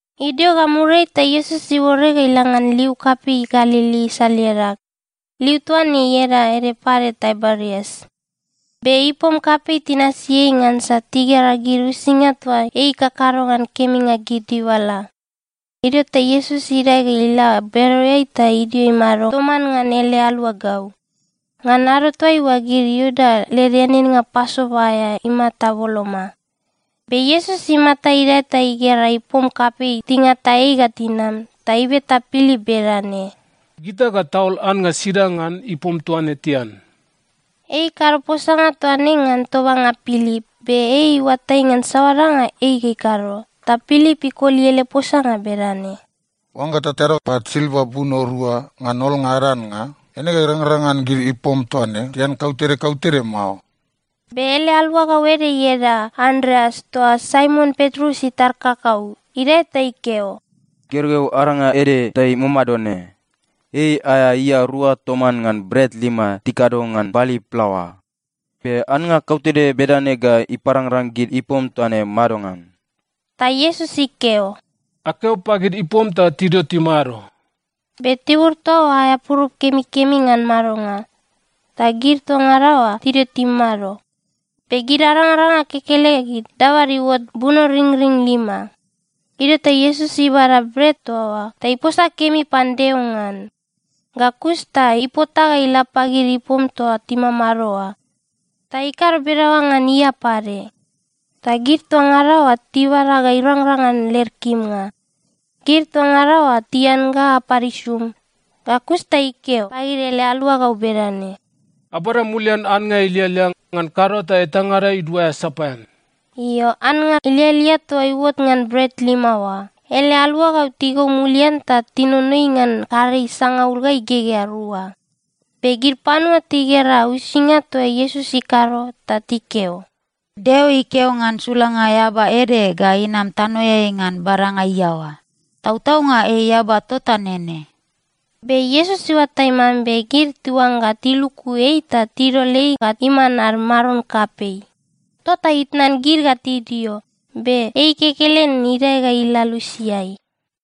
Idio ga muriai, ta Iesus iuore ga ila ngan liu kapei Galili isal iadag. (Liu toa ne ieda ede pade Taiberias.) Be ipom kapei tinasi ei ngansa tigera gid uisinga toa ei ikakado ngan keminga gid dibala. Idio ta Iesus idae ga ila bereoeai ta idio imado toman ngan ele aluagau. Ngan ado toaiua, gid Iuda led eaneannga Pasova aea imata boloma. Be Iesus imata idae ta igera ipom kapei tingata ei ga tinam, ta ibeta Pilip bedane, “Gita ga taol annga sida ngan ipom toa ne tian?” Ei ikado posanga toa ne ngan tobanga Pilip. Be ei iuatai ngan saoa danga ei ga ikado. Ta Pilip ikoli ele posanga bedane, “Oangga tatado pat silva buno rua ngan olnga ad annga, eine ga irangrang ngan gid ipom toa ne tian kautede kautede mao.” Be ele aluagau ede ieda Andreas toa Saimon Petrus itar kakau idae ta ikeo, “Gergeu aranga ede ta imamado ne. Ei aea ia rua toman ngan bret lima tikado ngan bali plaoa. Be annga kautede bedane ga iparangrang gid ipom toa ne madongan?” Ta Iesus ikeo, “Akeo pagid ipom ta tidio timado.” Be tibur toa oa aea purup kemikemi ngan madonga. Ta gid toa ngada oa tidio timado. Be gid arangaranga kekelegid dabad iuot bunoringring lima. Idio ta Iesus ibada bret toa oa ta iposa kemi pan Deo ngan. Ga kus ta ipota ga ila pagid ipom toa timamado oa. Ta ikado bedaoa ngan ia pade. Ta gid toa ngada oa tibada ga irangrang ngan led kimnga. Gid toa ngada oa tian ga apad isum. Ga kus ta ikeo pagid ele aluagau bedane, “Abada mulian annga ilialia, ngan kado ta etangada iduaea sapaean.” Io, annga ilialia toa iuot ngan bret lima oa, ele aluagau tigou mulian ta tinonoi ngan karei sangaul ga igegea rua. Be gid panua tigera uisinga toa Iesus ikado ta tikeo, “Deo ikeo ngan sulanga eaba ede ga inam tanoeai ngan badanga iaoa. Tautaunga ei eaba tota nene!” Be Iesus iuatai mambe gid tiuangga tiluku ei ta tidol ei ga iman ad maron kapei. Tota itnan gid ga tidio, be ei kekelen idae ga ila lusiai.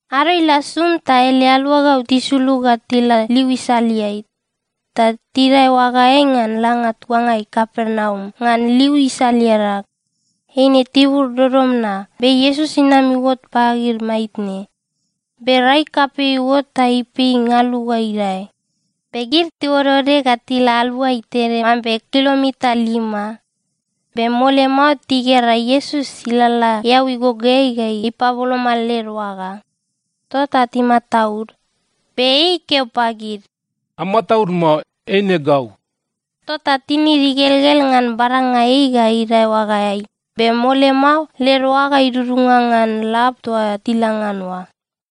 Ado ila sum ta ele aluagau tisulug ga tila liu isaleai. Ta tidae oagaeai ngan langa tuangai Kapernaum ngan liu isal iadag. Eine tibur dodom na. Be Iesus inam iuot pagid maitne. Be rai kapei iuot ta ipei ngalu ga idae. Be gid tiuodeode ga tila aluai tede mambe kilomita lima. Be mole mao tigera Iesus ilalala eau igogoeai ga ipaboloma led oaga. Tota timataud. Be ei ikeo pagid, “Amataud mao. Eine gau.” Tota tinid igelgel ngan badanga ei ga idae oagaeai. Be mole mao led oaga idudunga ngan lab toa tila ngan oa.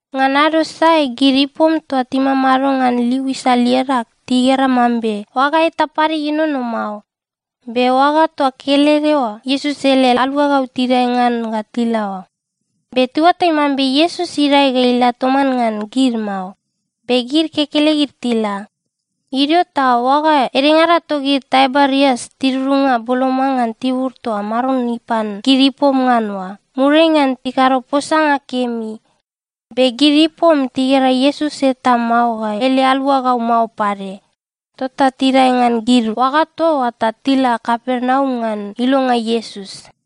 Ngan ado sae, gid ipom toa timamado ngan liu isal iadag tigera mambe oaga eta pade ienono mao. Be oaga toa kelede oa Iesus ele aluagau tidae ngan ga tila o. Be tiuatai mambe Iesus idae ga ila toman ngan gid mao, be gid kekelegid tila. Idio ta oaga edengada togid Taiberias tidudunga boloma ngan tibur toa Maron ipan gid ipom ngan oa, muriai ngan ikado posanga kemi. Be gid ipom tigera Iesus eta mao ga ele aluagau mao pade, tota tidae ngan gid oaga toa oa ta tila Kapernaum ngan ilonga Iesus.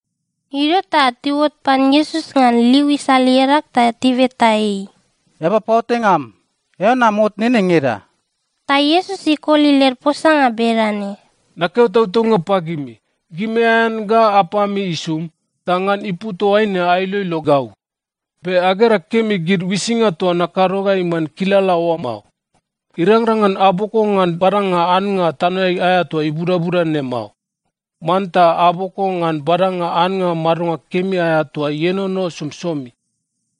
Idio ta tiuot pan Iesus ngan liu isal iadag ta tibeta ei, “Eaba paoatainga am, eao nam ot nene ngeda?” Ta Iesus ikoli led posanga bedane, “Nakeo tautaunga pagimi, gimi aean ga apami isum, ta ngan ipu toaine ailoilo gau. Be agera kemi gid uisinga toa nakado ga iman kilala oa mao. Irangrang ngan aboko ngan badanga annga tanoeai aea toa ibudabuda ne mao. Manta aboko ngan badanga annga madonga kemi aea toa ienono somisomi.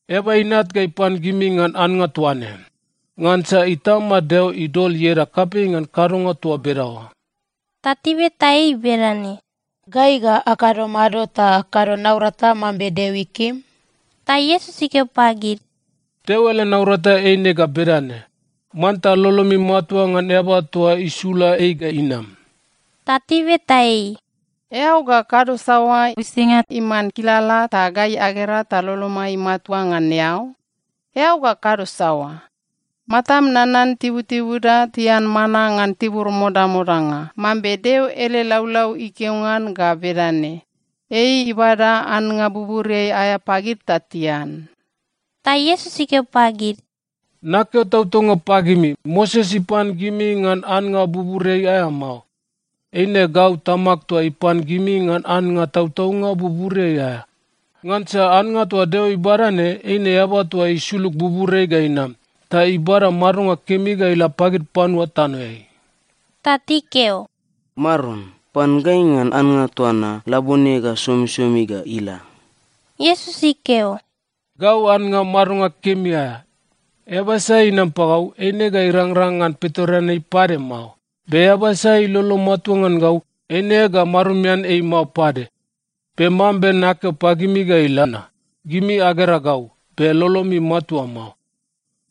Eaba Inat ga ipan gimi ngan annga toa ne. Ngansa Itama Deo idol ieda kapei ngan kadonga toa bedaoa.” Ta tibeta ei bedane, “Gai ga akado mado ta akado naurata mambe Deo ikim?” Ta Iesus ikeo pagid, “Deo ele naurata eine ga bedane: Manta lolomi matua ngan eaba toa isula ei ga inam.” Ta tibeta ei, “Eao ga kado saoa uisinga iman kilala ta gai agera ta lolomai matua ngan eao? Eao ga kado saoa? Matam nanan tibutibuda tian mana ngan tibur modamodanga, mambe Deo ele laulau ikeo ngan ga bedane, ‘Ei ibada annga buburiai aea pagid ta tian.’” Ta Iesus ikeo pagid, “Nakeo tautaunga pagimi, Moses ipan gimi ngan annga buburiai aea mao. Eine gau Tamag toa ipan gimi ngan annga tautaunga buburiai aea. Ngansa annga toa Deo ibada ne, eine eaba toa isulug buburiai ga inam. Ta ibada madonga kemi ga ila pagid panua tanoeai.” Ta tikeo, “Maron, pan gai ngan annga toa na labone ga somisomi ga ila!” Iesus ikeo, “Gau annga madonga kemi aea. Eaba sai inam pagau, eine ga irangrang ngan pitoreanei pade mao. Be eaba sai ilolo matua ngan gau, eine ga marumian ei mao pade. Be mambe nakeo pagimi ga ila na, gimi agera gau, be lolomi matua mao.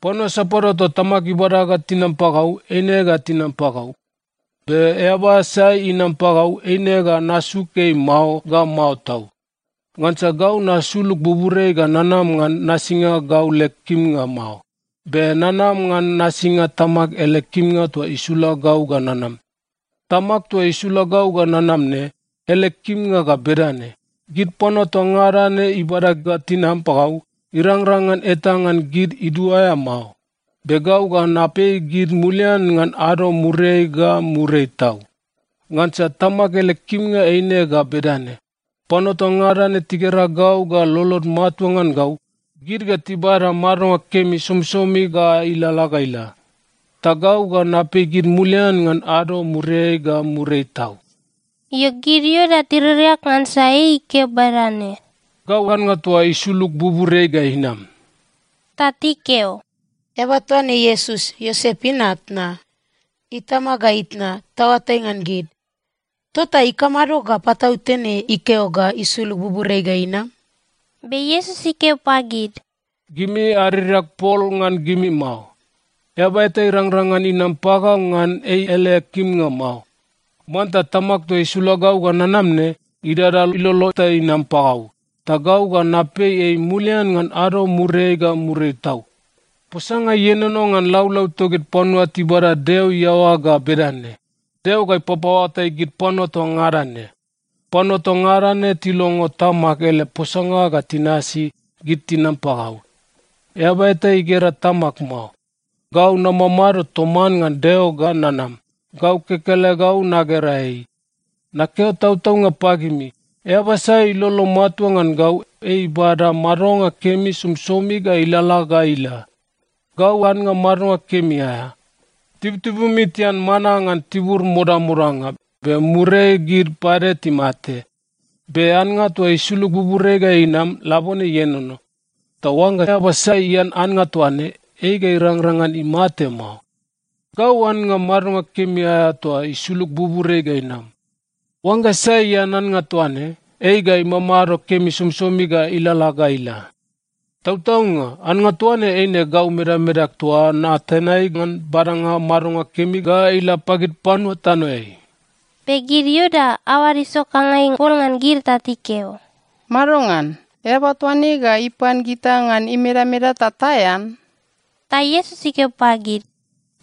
Panua sapadua toa Tamag ibada ga tinam pagau, eine ga tinam pagau. Be eaba sai inam pagau, eine ga nasuk ei mao ga mao tau. Ngansa gau nasulug buburiai ga nanam ngan nasinga gau leg kimnga mao. Be nanam ngan nasinga Tamag ele kimnga toa isula gau ga nanam. Tamag toa isula gau ga nanam ne, ele kimnga ga bedane: Gid panua toa ngada ne ibada ga tinam pagau, irangrang ngan eta ngan gid iduaea mao. Be gau ga napei gid mulian ngan ado muriai ga muriai tau. Ngansa Tamag ele kimnga eine ga bedane: Panua toa ngada ne tigera gau ga lolod matua ngan gau, gid ga tibada madonga kemi somisomi ga ilalala ga ila. Ta gau ga napei gid mulian ngan ado muriai ga muriai tau.” Io, gid Iuda tiririak ngansa ei ikeo bedane, “Gau annga toa isulug buburiai ga inam.” Ta tikeo, “Eaba toa ne Iesus, Iosep inat na? Itama ga itna, taoatai ngan gid. Tota ikamado ga patautene ikeo ga isulug buburiai ga inam?” Be Iesus ikeo pagid, “Gimi aririak pol ngan gimi mao. Eaba eta irangrang ngan inam pagau ngan ei ele kimnga mao. Manta Tamag toa isula gau ga nanam ne idada ilolo ta inam pagau, ta gau ga napei ei mulian ngan ado muriai ga muriai tau. Posanga ienono ngan laulau togid panua tibada Deo iaoa ga bedane, ‘Deo ga ipapaoatai gid panua toa ngada ne.’ Panua toa ngada ne tilongo Tamag ele posanga ga tinasi, gid tinam pagau. Eaba eta igera Tamag mao. Gau namamado toman ngan Deo ga nanam, gau kekelegau nagera ei. Nakeo tautaunga pagimi, eaba sai ilolo matua ngan gau, ei ibada madonga kemi somisomi ga ilalala ga ila. Gau annga madonga kemi aea. Tibutibumi tian mana ngan tibur modamodanga, be muriai gid pade timate. Be annga toa isulug buburiai ga inam, labone ienono. Ta oangga eaba sai ian annga toa ne, ei ga irangrang ngan imate mao. Gau annga madonga kemi aea toa isulug buburiai ga inam. Oangga sai ian annga toa ne, ei ga imamado kemi somisomi ga ilalala ga ila. Tautaunga, annga toa ne eine gau medamedag toa natenai ngan badanga madonga kemi ga ila pagid panua tanoeai.” Be gid Iuda aoad isokangai pol ngan gid ta tikeo, “Madongan? Eaba toa ne ga ipan gita ngan imedameda ta taean?” Ta Iesus ikeo pagid,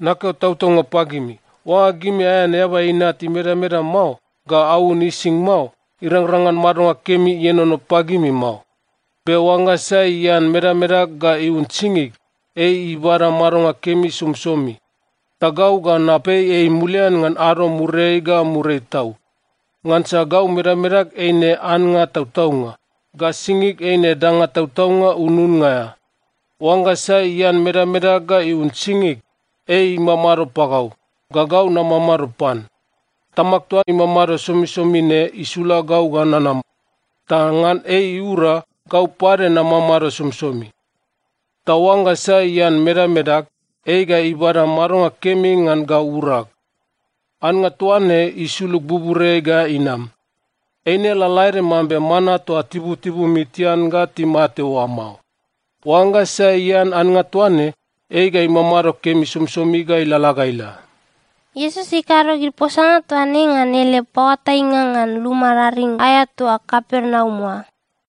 “Nakeo tautaunga pagimi, oangga gimi aean Eaba Inat imedameda mao ga aun ising mao, irangrang ngan madonga kemi ienono pagimi mao. Be oangga sai ian medamedag ga iun singig, ei ibada madonga kemi somisomi. Ta gau ga napei ei mulian ngan ado muriai ga muriai tau. Ngansa gau medamedag eine annga tautaunga, ga singig eine danga tautaunga ununnga aea. Oangga sai ian medamedag ga iun singig, ei imamado pagau, ga gau namamado pan. Tamag toa imamado somisomi ne isula gau ga nanam. Ta ngan ei iura, gau pade namamado somisomi. Ta oangga sai ian medamedag, ei ga ibada madonga kemi ngan gau urag. Annga toa ne isulug buburiai ga inam. Eine lalaede mambe mana toa tibutibumi tian ga timate oa mao. Oangga sai ian annga toa ne, ei ga imamado kemi somisomi ga ilalala ga ila.” Iesus ikado gid posanga toa ne ngan ele paoatainga ngan luma raring aea toa Kapernaum oa.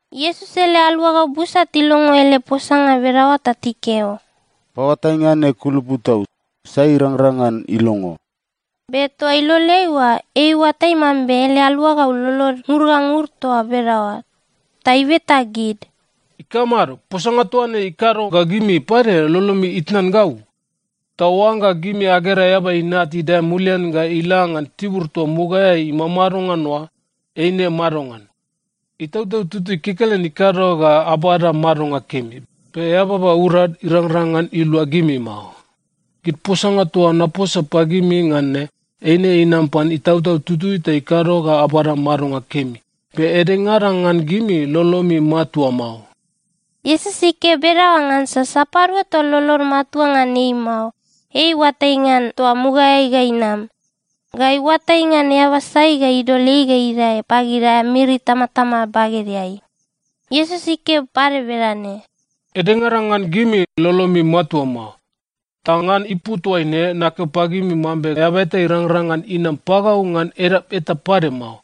Iesus ele aluagau busa tilongo ele posanga bedaoa ta tikeo, “Paoatainga ne kulupu tau! Sai ga irangrang ngan ilongo?” Be toa iloleai oa ei iuatai mambe ele aluagau lolod ngur ga ngur toa bedaoa. Ta ibeta gid, “Ikamado? Posanga toa ne ikado ga gimi pade lolomi itnan gau? Ta oangga gimi agera Eaba Inat idae mulian ga ila ngan tibur toa mugaeai imamado ngan oa, eine madongan? Itautau Tutui kekelen ikado ga abada madonga kemi, be eababa urad irangrang ngan ilua gimi mao. Gid posanga toa naposa pagimi ngan ne, eine inam pan Itautau Tutui ta ikado ga abada madonga kemi. Be edengada ngan gimi, lolomi matua mao.” Iesus ikeo bedaoa ngansa sapadua toa lolod matua ngan ei mao, ei iuatai ngan toa mugaeai ga inam. Ga iuatai ngan eaba sai ga idol ei ga idae pagid aea miri itamatama bagedeai. Iesus ikeo pade bedane, “Edengada ngan gimi, lolomi matua mao. Ta ngan ipu toaine nakeo pagimi mambe eaba eta irangrang ngan inam pagau ngan edap eta pade mao.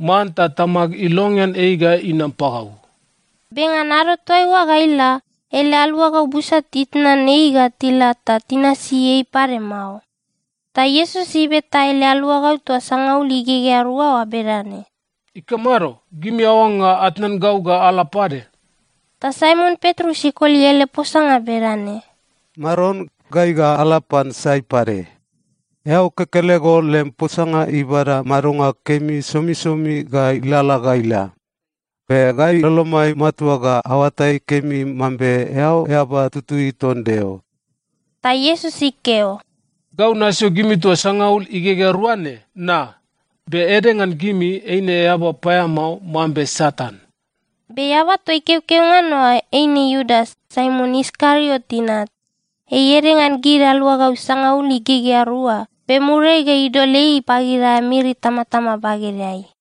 Manta Tamag ilongean ei ga inam pagau.” Be ngan ado toaiua ga ila, ele aluagau busa titnan ei ga tila ta tinasi ei pade mao. Ta Iesus ibeta ele aluagau toa sangaul igegea rua oa bedane, “Ikamado? Gimi aoangga atnan gau ga ala pade?” Ta Saimon Petrus ikoli ele posanga bedane, “Maron, gai ga ala pan sai pade? Eao kekelego lem posanga ibada madonga kemi somisomi ga ilalala ga ila. Be gai lolomai matua ga aoatai kemi mambe eao Eaba Tutui ton Deo.” Ta Iesus ikeo, “Gau nasio gimi toa sangaul igegea rua ne, na? Be ede ngan gimi, eine eaba paeamao mambe Satan.” Be eaba toa ikeokeo ngan oa eine Iudas, Saimon Iskariot inat. Ei ede ngan gid aluagau sangaul igegea rua, be muriai ga idol ei pagid aea miri itamatama bagedeai.